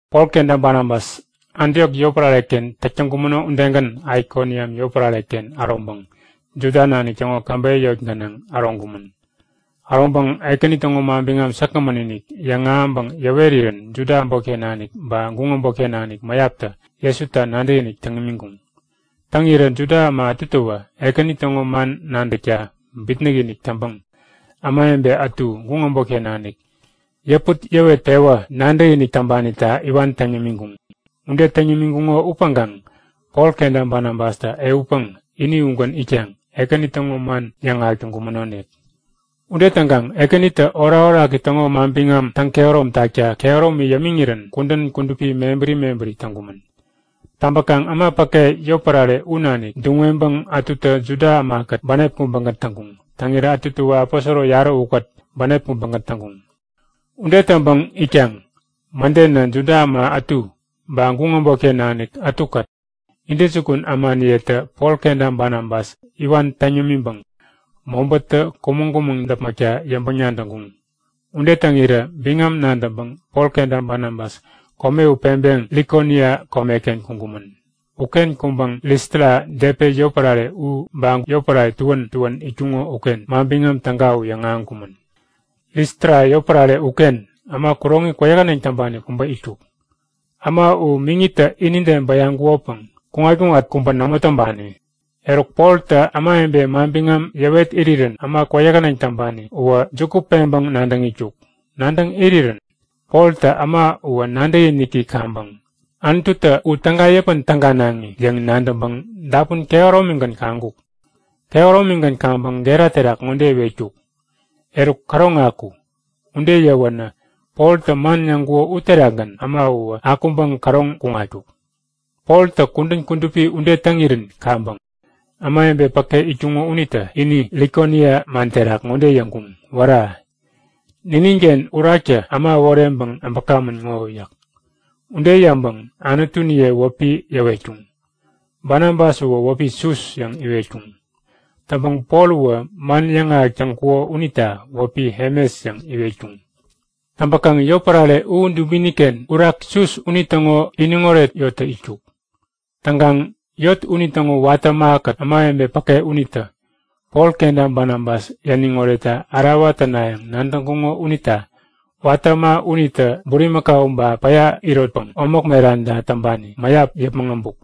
Pol kenta Banabas Antiok yotpärare-ken täk täŋkumäno udegän Aikoniam yotpärare-ken äroŋpäŋ Juda nanik täŋo käbeyä yot gänaŋ äroŋkumän. Äroŋpäŋ Ekäni täŋo manbiŋam säkgämän-inik yäŋahäŋpäŋ yäwerirän Juda äbotken nanik ba guŋ äbotken nanik mäyaptä Jesuta nadäkinik täŋkuŋ. Täŋirä Juda äma ätutäwä Ekäni täŋo man nadäkta bitnäk-inik täŋpäŋ ämawebe ätu guŋ äbotken nanik yäput-yäwet-pewä nadäkinik täŋpanita iwan täŋ yämiŋkuŋ. Ude täŋ yämiŋkuŋo upäŋkaŋ Pol kenta Banabastä ehutpäŋ ini ugän itkaŋ Ekäni täŋo man yäŋahäk täŋkumänonik. Ude täŋkaŋ Ekänitä orakoraki täŋo manbiŋam täŋkehärom takta kehäromi yämiŋirän kudän kudupi mebäri mebäri täŋkumän. Täŋpäkaŋ äma päke yotpärare u nanik duŋ-weŋpäŋ ätutä Juda ämakät bänep kubägän täŋkuŋ. Täŋirä ätutäwä aposoro yarä ukät bänep kubägän täŋkuŋ. Ude täŋpäŋ itkaŋ mädenä Juda äma ätu ba guŋ äbotken nanik ätukät intäjukun ämaniyetä Pol kenta Banabas iwan täŋ yämiŋpäŋ mobätä kumäŋ-kumäŋ däpmäkta yäŋpäŋ-nadäŋkuŋ. Ude täŋirä biŋam nadäŋpäŋ Pol kenta Banabas kome u peŋpeŋ Likonia komeken kuŋkumän. Uken kuŋpäŋ Listra Depe yotpärare ba yotpärare tuän tuän itkuŋo uken Manbiŋam Täga u yäŋahäŋkumän. Listra yotpärare uken äma kuroŋi kwäyähäneŋ täŋpani kubä itkuk. Äma u miŋitä inide bäyaŋkukopäŋ kuŋat-kuŋat kubä nämo täŋpani. Eruk Poltä ämawebe manbiŋam yäwet irirän äma kwäyähäneŋ täŋpani uwä juku peŋpäŋ nadäŋ itkuk. Nadäŋ irirän Poltä äma uwä nadäkiniki kaŋpäŋ Anututä u täga yäpän-täganaŋi yäŋ nadäŋpäŋ dapun kehäromigän kaŋkuk. Kehäromigän kaŋpäŋ gera terak ŋode iwetkuk; Eruk, käroŋ aku! Ude yäwänä Poltä man yäŋkuko uterakgän äma uwä akuŋpäŋ käroŋ kuŋatkuk. Poltä kudän kudupi ude täŋirän kaŋpäŋ ämawebe päke itkuŋo unitä ini Likonia man terak ŋode yäŋkuŋ; Wära! Nininken uraktä äma äworeŋpäŋ äbäkamän ŋo! yäk. Ude yäŋpäŋ anutuniye wäpi yäwetkuŋ. Banabas uwä wäpi Sus yäŋ iwetkuŋ. Täŋpäŋ Pol uwä man yäŋahäk täŋkuko unita wäpi Hemes yäŋ iwetkuŋ. Täŋpäkaŋ yotpärare u dubini-ken urak Sus unitäŋo iniŋoret yottä itkuk. Täŋkaŋ yot unitäŋo watä ämakät ämawebe päke unitä Pol kenta Banabas yäniŋ oretta ärawa tänayäŋ nadäŋkuŋo unita watä äma unitä bulimakau ba päya irotpäŋ omäk meranta täŋpani mäyap yäpmäŋ äbuk.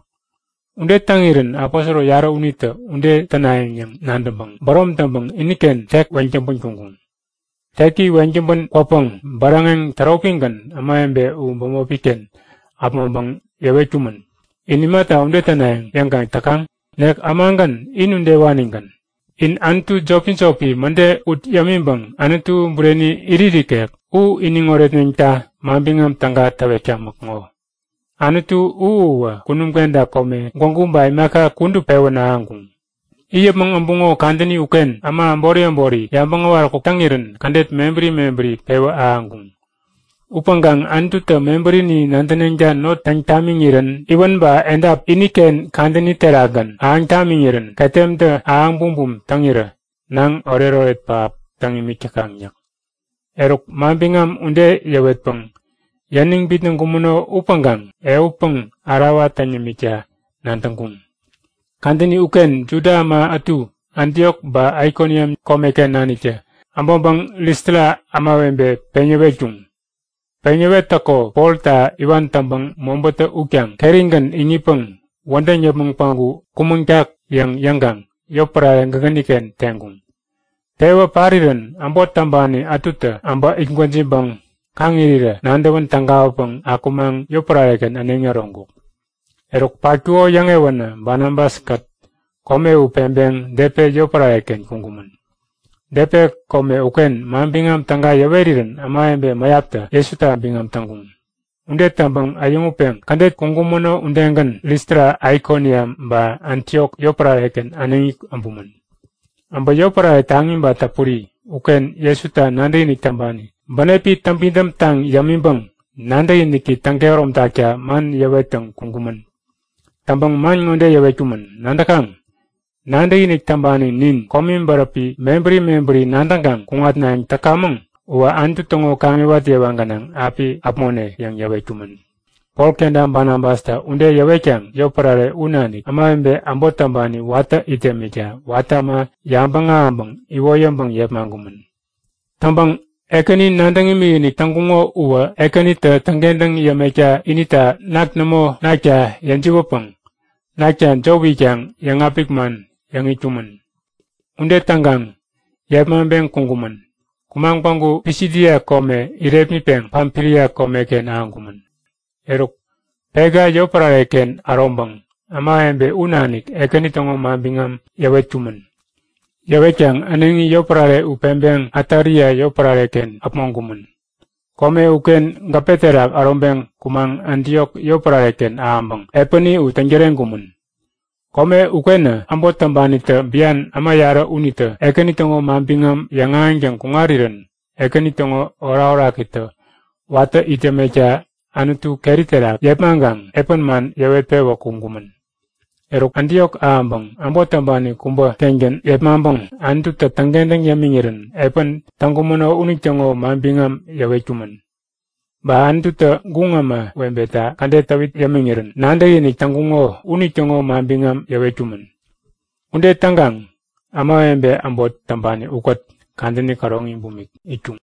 Ude täŋirän aposoro yarä unitä ude tänayäŋ yäŋ yabäŋpäŋ bärom täŋpäŋ iniken tek weŋ täŋpän kuŋkuŋ. Teki weŋ täŋpän kwäpäŋ bäräŋeŋ täropigän ämawebe u bämopi-ken äpmoŋpäŋ yäwetkumän; In imata ude tänayäŋ yäŋkaŋ täkaŋ? Nek ämagän, in udewanigän! In anutu jopi-jopi mäde ut yämiŋpäŋ Anutu Bureni irit ikek u iniŋ oretneŋta Manbiŋam Täga täwetkamäk ŋo. Anutu u uwä kunum kenta kome gwägu ba imaka kudup pewän ahäŋkuŋ. It yäpmäŋ äbuŋo kadäni uken äma äbori äbori yabäŋ äwaräkuk täŋirän kädet mebäri mebäri pewä ahäŋkuŋ. Upäŋkaŋ Anututä mebärini nadäneŋta not täŋ tamiŋirän iwän ba edap iniken kadäni terakgän ahäŋ tamiŋirän ketemtä ahäŋ bumbum täŋirä naŋ oretoret pähap täŋ it täkaŋ yäk. Eruk manbiŋam ude yäwetpäŋ yäniŋ bitnäŋkumäno upäŋkaŋ ehutpäŋ ärawa täŋ yämikta nadäŋkuŋ. Kadäni uken Juda äma ätu Antiok ba Aikoniam komeken naniktä äbäŋpäŋ Listra ämawebe peŋ yäwetkuŋ. Peŋ yäwettäko Polta iwan täŋpäŋ mobätä utkaŋ kerigän iŋitpäŋ wädäŋ yäpmäŋ päŋku kumäŋtak yäŋ yäŋkaŋ yotpärare gägäni-ken teŋkuŋ. Tewä parirän äbot täŋpani ätutä äbä it gwäjiŋpäŋ kaŋ irirä nadäwän tägawäpäŋ akumaŋ yotpärare-ken äneŋi äroŋkuk. Eruk patkuko yäŋewänä Banabas-kät kome u peŋpeŋ Depe yotpärare-ken kuŋkumän. Depe kome uken Manbiŋam Täga yäwerirän ämawebe mäyaptä Jesuta biŋam täŋkuŋ. Ude täŋpäŋ äyäŋutpeŋ kädet kuŋkumäno udegän Listra Aikoniam ba Antiok yotpärare-ken äneŋi äbumän. Äbä yotpärare taŋi ba täpuri uken Jesuta nadäkinik täŋpani bänepi täŋpidäm taŋ yämiŋpäŋ nadäkiniki täŋkehärom takta man yäwettäŋ kuŋkumän. Täŋpäŋ man ŋode yäwetkumän; Nadäkaŋ? Nadäkinik täŋpani nin komi bäräpi mebäri mebäri nadäŋkaŋ kuŋatnayäŋ täkamäŋ uwä Anutu täŋo kaŋiwat yewa gänaŋ api äpmone yäŋ yäwetkumän. Pol kenta Banabastä ude yäwetkaŋ yotpärare u nanik ämawebe äbot täŋpani watä it yämikta watä äma yabäŋ ahäŋpäŋ iwoyäŋpäŋ yepmaŋkumän. Täŋpäŋ Ekäni nadäŋ imikinik täŋkuŋo uwä Ekänitä täŋkentäŋ yämekta inita nak nämo nakta yäjiwätpäŋ nakta jop itkaŋ yäŋapik man yäŋ itkumän. Ude täŋkaŋ yepmaŋpeŋ kuŋkumän. Kumaŋ päŋku Pisidia kome irepmitpeŋ Pamfilia komeken ahäŋkumän. Eruk Pega yotpärare-ken äroŋpäŋ ämawebe u nanik Ekäni täŋo manbiŋam yäwetkumän. Yäwetkaŋ äneŋi yotpärare u peŋpeŋ Atalia yotpärare-ken äpmoŋkumän. Kome uken gäpe terak äroŋpeŋ kumaŋ Antiok yotpärare-ken ahäŋpäŋ epäni u täŋ-täreŋkumän. Kome ukenä äbot täŋpanitä bian äma yarä unitä Ekäni täŋo manbiŋam yäŋahäŋtäŋ kuŋarirän Ekäni täŋo orakorakitä watä it yämekta Anutu keri terak yepmaŋkaŋ epän man yäwet-pewä kuŋkumän. Eruk Antiok ahäŋpäŋ äbot täŋpani kubä-kengän yepmaŋpäŋ Anututä täŋkentäŋ yämiŋirän epän täŋkumäno unitäŋo manbiŋam yäwetkumän. Ba Anututä guŋ ämawebeta kädet täwit yämiŋirän nadäkinik täŋkuŋo unitäŋo manbiŋam yäwetkumän. Ude täŋkaŋ ämawebe äbot täŋpani ukät kadäni käroŋi bumik itkuŋ.